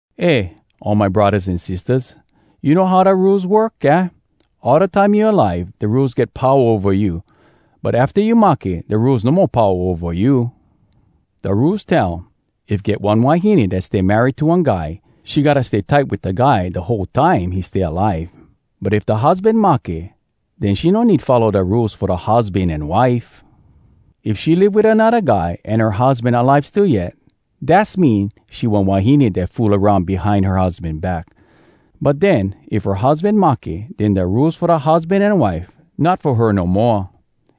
Eh, all my braddahs an sistahs, you know how da Rules work, aah? All da time you alive, da Rules get powa ova you. But afta you mahke, da Rules no mo powa ova you. Da Rules tell, if get one wahine dat stay married to one guy, she gotta stay tight wit da guy da whole time he stay alive. But if da husban mahke, den she no need follow da Rules fo da husban an wife. If she live wit anodda guy, an her husban alive still yet, dass mean she one wahine dat fool aroun behind her husban back. But den, if her husban mahke, den da Rules fo da husban an wife not fo her no moa.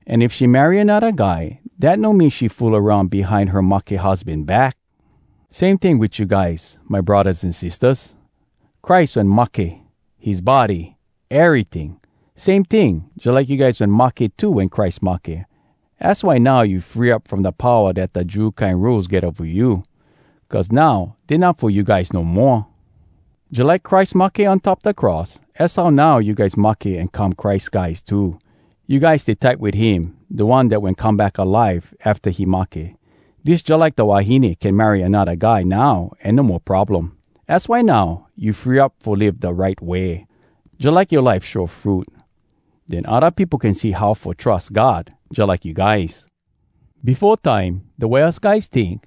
An if she marry anodda guy, dat no mean she fool aroun behind her mahke husban back. Same ting wit you guys, my braddahs an sistahs! Christ wen mahke, his body, eryting. Same ting, jalike you guys wen mahke too wen Christ mahke. Az why now you free up from da powa dat da Jew kine Rules get ova you. Cuz now dey not fo you guys no moa. Jalike Christ mahke on top da cross, az how now you guys mahke an come Christ guys too. You guys stay tight wit him, da one dat wen come back alive afta he mahke. Dis jalike da wahine can marry anodda guy now an no mo problem. Az why now, you free up fo live da right way, jalike yoa life show fruit. Den odda peopo can see how fo trus God jalike you guys. Befo time, da way us guys tink,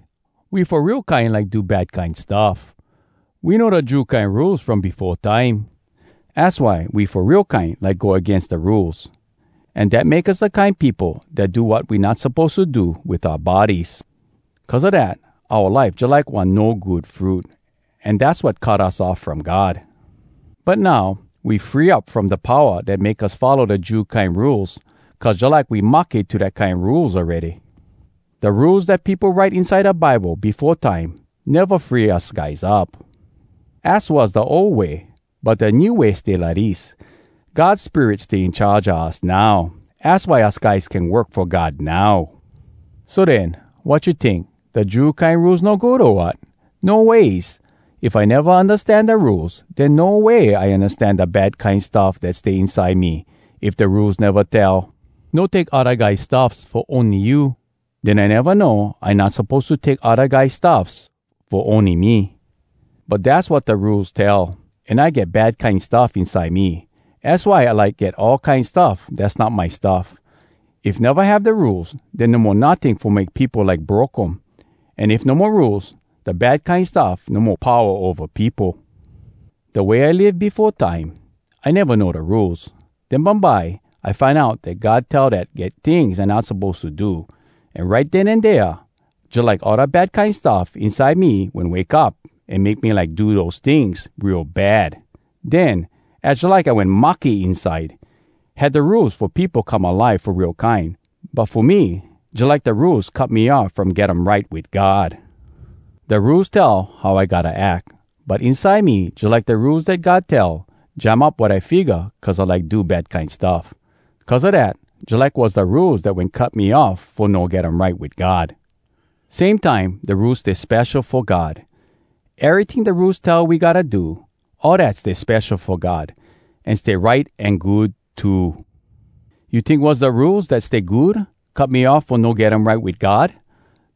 we fo real kine like fo do bad kine stuff. We know da Jew kine Rules from befo time. Az why we fo real kine like go agains da Rules. An dat make us da kine peopo dat do wat we not suppose to do wit oua bodies. Cuz a dat, oua life jalike one no good fruit, an dass wat cut us off from God. But now, we free up from da powa dat make us follow da Jew kine Rules cuz jalike we mahke to dat kine Rules awready. Da Rules dat peopo write inside da Bible befo time neva free us guys up. Az was da ol way. But da new way stay lidis. God Spirit stay in charge a us now! Az why us guys can work fo God now. So den, wat you tink? Da Jew kine Rules no good, o wat? No ways! If I neva undastan da Rules, den no way I undastan da bad kine stuff dat stay inside me. If da Rules neva tell, “No take odda guys stuffs fo ony you,” den I neva know I not suppose to take odda guys stuffs fo ony me. But dass wat da Rules tell. An I get bad kine stuff inside me. Az why I like get all kine stuff dass not my stuff. If neva have da Rules, den no mo notting fo make peopo like broke um. An if no mo Rules, da bad kine stuff no mo powa ova peopo. Da way I live befo time, I neva know da Rules. Den bumbye, I find out dat God tell dat get tings I not suppose to do—an right den an dea, jalike all da bad kine stuff inside me wen wake up an make me like do dose tings real bad! Den, az jalike I wen mahke inside. Had da Rules fo peopo come alive fo real kine. But fo me, jalike da Rules cut me off from get um right wit God. Da Rules tell how I gotta ack. But inside me jalike da Rules dat God tell jam up wat I figga cuz I like do bad kine stuff. Cuz a dat, jalike was da Rules dat wen cut me off fo no get um right wit God. Same time, da Rules stay spesho fo God. Eryting da Rules tell we gotta do, all dat stay spesho fo God. An stay right an good too. You tink was da Rules dat stay good cut me off fo no get um right wit God?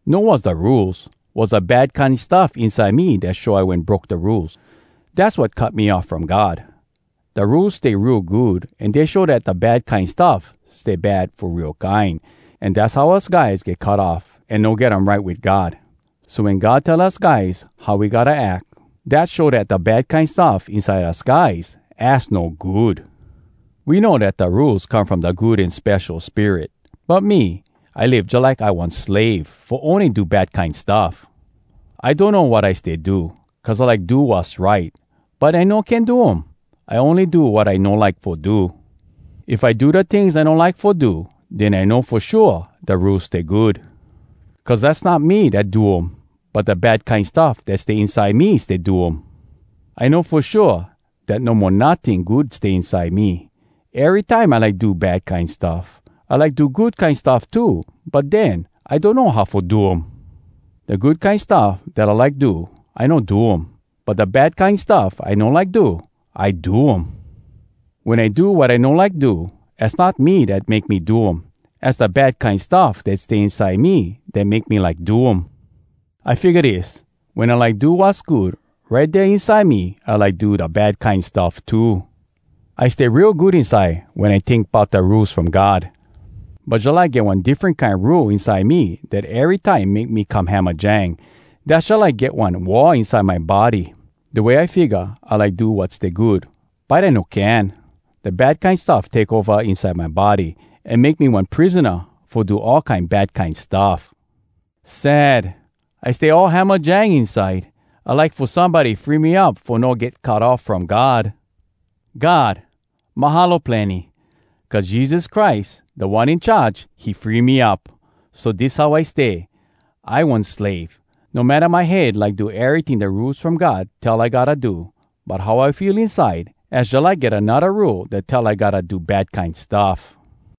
No was da Rules! Was da bad kine stuff inside me dat show I wen broke da Rules. Dass wat cut me off from God! Da Rules stay real good, an dey show dat da bad kine stuff stay bad fo real kine. An dass how us guys get cut off an no get um right wit God. So wen God tell us guys how we gotta ack, dat show dat da bad kine stuff inside us guys az no good! We know dat da Rules come from da Good An Spesho Spirit. But me, I live jalike I one slave fo ony do bad kine stuff. I donno wat I stay do. Cuz I like do wass right, but I no can do um. I ony do wat I no like fo do! If I do da tings I no like fo do, den I know fo shua da Rules stay good. Cuz dass not me dat do um, but da bad kine stuff dat stay inside me stay do um. I know fo shua dat no mo notting good stay inside me. Erytime I like do bad kine stuff. I like do good kine stuff too, but den, I donno how fo do um! Da good kine stuff dat I like do, I no do um. But da bad kine stuff I no like do, I do um. Wen I do wat I no like do, az not me dat make me do um. Az da bad kine stuff dat stay inside me dat make me like do um. I figga dis: wen I like do wass good, right dea inside me I like do da bad kine stuff too. I stay real good inside wen I tink bout da Rules from God. But jalike get one diffren kine rule inside me dat erytime make me come hamajang. Dass jalike get one war inside my body! Da way I figga, I like do wat stay good, but I no can. Da bad kine stuff take ova inside my body, an make me one prisona fo do all kine bad kine stuff. Sad! I stay all hamajang inside! I like fo somebody free me up fo no get cut off from God! God, mahalo plenny! Cuz Jesus Christ, Da One In Charge, he free me up! So dis how stay: I one slave. No matta my head like do eryting da Rules From God tell I gotta do—but how I feel inside, az jalike get anodda rule dat tell I gotta do bad kine stuff.